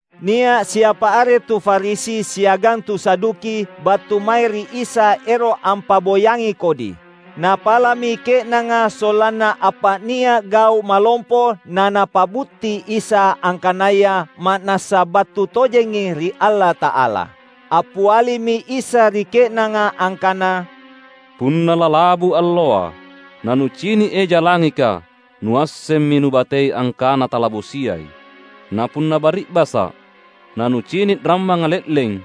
Nia’ siapa are tu Farisi siagang tu Saduki battu mae ri Isa ero’ ampa’boyangi kodi. Napala’mi ke’nanga sollanna appa’nia’ gau’ malompo na Napa’butti Isa angkanaya ma’nassa battu tojengi ri Allata’ala. Appialimi Isa ri ke’nanga angkana, "Punna lalabu alloa, nanucini’ eja langika nuassemmi nubatei angkana talabosiai. Na punna bari’basa’, nanucini’ rammanga le’leng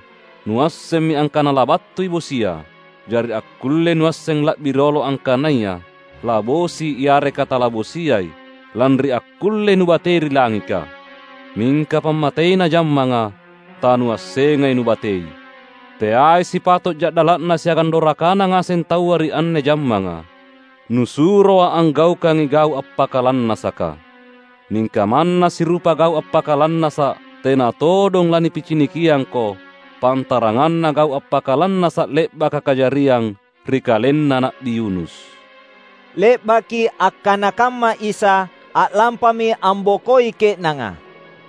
nuassemmi angkana labattui bosia. Jari akkullei nuasseng la’bi riolo angkanaya labosi yareka talabosiai lanri akkullei nubatei ri langika. Mingka pammateina jammanga tanuassengai nubatei. Teai sipato’ ja’dala’na siagang dorakana ngaseng taua ri anne jammanga. NusuroA’ anggaukangi gau’ appakalannasaka. Mingka manna sirupa gau’ appakalannasa’ tena todong lanipicinikiangko, pantaranganna gau’ appakalannasa’ le’baka kajariang ri kalenna Na’bi Yunus." Le’baki akkana kamma Isa, a’lampami ambokoi ke’nanga.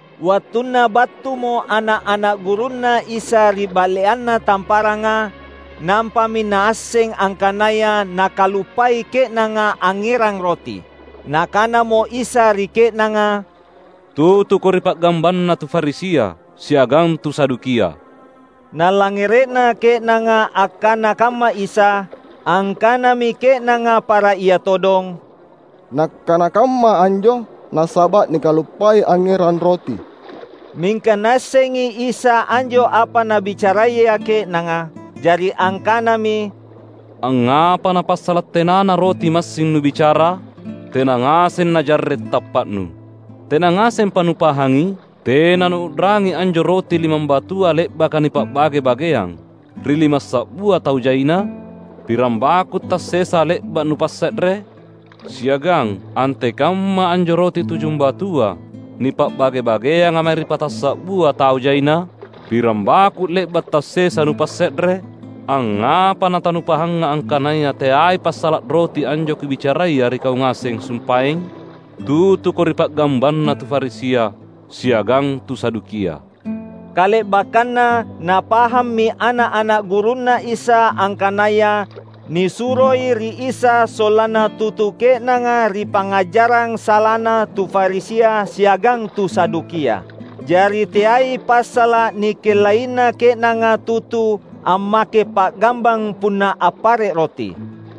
Wattunna battumo ana’-ana’ gurunNa Isa ri ba’leanna tamparanga nampami naasseng angkanaya nakaluppai ke’nanga angngerang roti. Nakanamo Isa ri ke’nanga, "Tutuko ri pa’gambanna tu Farisia siagang tu Sadukia." Nalangngere’na ke’nanga akkana kamma Isa, angkanami ke’nanga para ia todong, "Nakkana kamma anjo nasaba’ nikaluppai angngerang roti." Mingka Naassengi Isa anjo apa nabicaraya ke’nanga. Jari angkanami, "Angngapa napassala’ tenana roti massing nubicara? Tena ngaseng najarre’ tappa’nu! Tena ngasempa nupahangi? Tena nuu’rangi anjo roti limambatua le’baka nipa’bage-bageang, ri limassa’bua tau jaina? Pirang baku’ tassesa le’ba’ nupasse’re? Siagang antekamma anjo roti tujumbatua nipa’bage-bageanga mae ri patassa’bua tau jaina? Pirang baku’ le’ba’ tassesa nupasse’re? Angngapa natanupahanga angkanaya teai passala’ roti anjo Kubicaraya ri kau ngaseng sumpaeng? Tutuko ri pa’gambanna tu Farisia siagang tu Sadukia!" Kale’bakkanna napahammi ana’-ana’ gurunNa Isa angkanaya nisuroi ri Isa sollanna tutu ke’nanga ri pangngajarang salana tu Farisia siagang tu Sadukia. Jari teai passala’ nikellaina ke’nanga tutu ammake pa’gambang punna appare’ roti.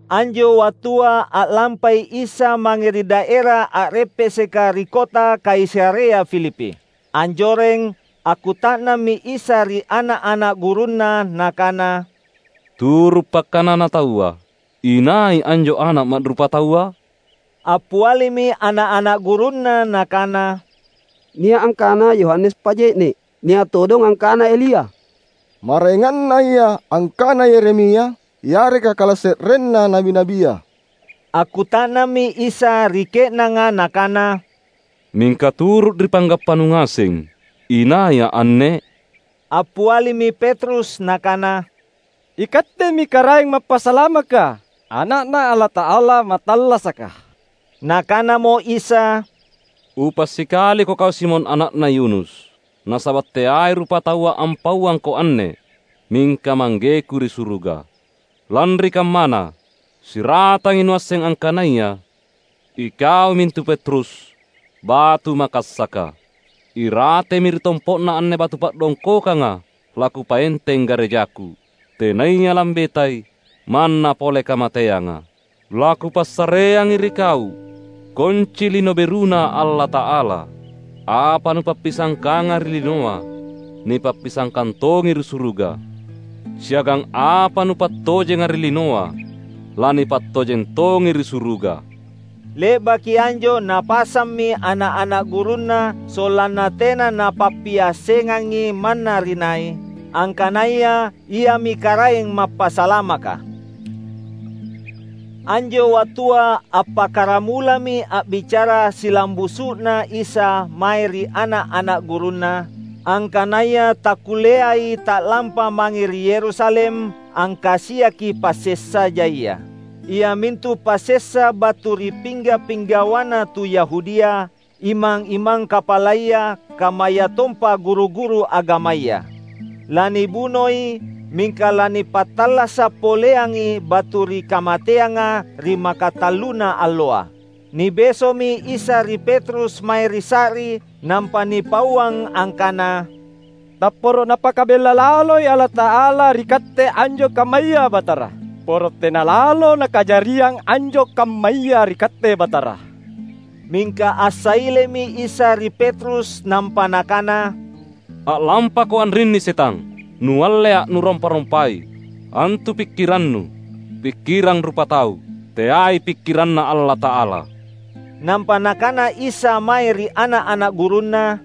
Anjo wattua a’lampai Isa mange ri daera a’reppeseka ri Kota Kaisarea Filipi. Anjoreng, akkuta’nammi Isa ri ana’-ana’ gurunNa Nakana, "Turu’ pakkanana taua, inai anjo Ana’ Ma’rupataua?" Appialimi ana’-ana’ gurunNa nakana, "Nia’ angkana Yohanes Paje’ne’. Nia’ todong angkana Elia. Maraengannaya angkana Yeremia, yareka kalase’renna na’bi-na’bia." Akkuta’nammi Isa ri ke’nanga Nakana, "Mingka turu’ ri panggappanu ngaseng inaiA’ anne?" Appialimi Petrus nakana, "IKattemi Karaeng Mappasalamaka, Ana’Na Allata’ala Mattallasaka." Nakanamo Isa, "Upa’ sikaliko kau Simon ana’na Yona! Nasaba’ teai rupataua ampauangko anne, mingka ManggeKu ri suruga. Lanri kammana, siratangi nuasseng angkanaya, ikau mintu Petrus, batu makassaka. Iratemi ri tompo’na anne batu pa’dongkokanga laKupaenteng garejaKu, tenaya lambetai, manna pole kamateanga. LaKupassareangi ri kau konci Lino BeruNa Allata’ala. Apa nupappisangkanga ri linoa, nipappisangkang tongi ri suruga. Siagang apa nupattojenga ri linoa, lanipattojeng tongi ri suruga." Le’baki anjo Napasammi ana’-ana’ gurunNa sollanna tena napappiassengangi manna ri nai, angkanaya Iami Karaeng Mappasalamaka. Anjo wattua appakkaramulami a’bicara silambusu’na Isa mae ri ana’-ana’ gurunNa, angkanaya takkulleai ta’lampa mange ri Yerusalem angkasiaki passessa jaia. Iamintu passessa battua ri pingga’-pinggawana tu Yahudia, imang-imang kapalaya, kammayatompa guru-guru agamaya. Lanibunoi, mingka lanipattallasa’ poleangi battu ri kamateanga ri makatalluna alloa! Nibeso’mi Isa ri Petrus mae ri sa’ri nampa nipauang angkana, "Tapporo Napakabella laloi Allata’ala ri Katte anjo kammaya, Batara! Poro tena lalo nakajariang anjo kammaya ri Katte Batara!" Mingka assailemi Isa ri Petrus nampa Nakana, "A’lampako anrinni, Setang! NualleA’ nurompa-rompai. Antu pikkirannu, pikkirang rupatau; teai pikkiranNa Allata’ala!" Nampa Nakana Isa mae ri ana’-ana’ gurunNa,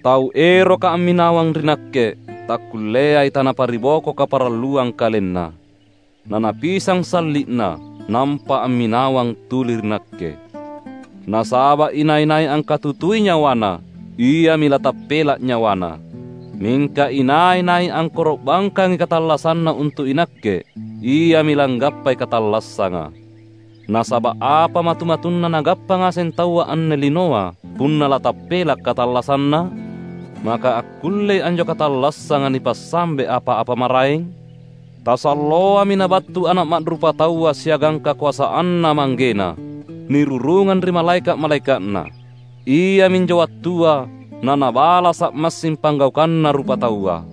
"Tau eroka amminawang ri Nakke takkulleai tanapariboko kaparalluang kalenna, nanapisang salli’na, nampa amminawang tuli ri Nakke. Nasaba’ inai-nai angkatutui nyawana, iami latappela’ nyawana. Mingka inai-nai angkoro’bangkangi katallassanna untu’ iNakke iami langgappai katallassanga. Nasaba’ apa matu-matunna nagappa ngaseng taua anne linoa punna latappela’ katallassanna? Maka akkullei anjo katallassanga nipassambe apa-apa maraeng? Tasalloami Nabattu Ana’ Ma’rupataua siagang kakoasanNa ManggeNa, nirurungang ri malaeka’-malaeka’Na. Iaminjo wattua naNabalasa’ massing panggaukanna rupataua.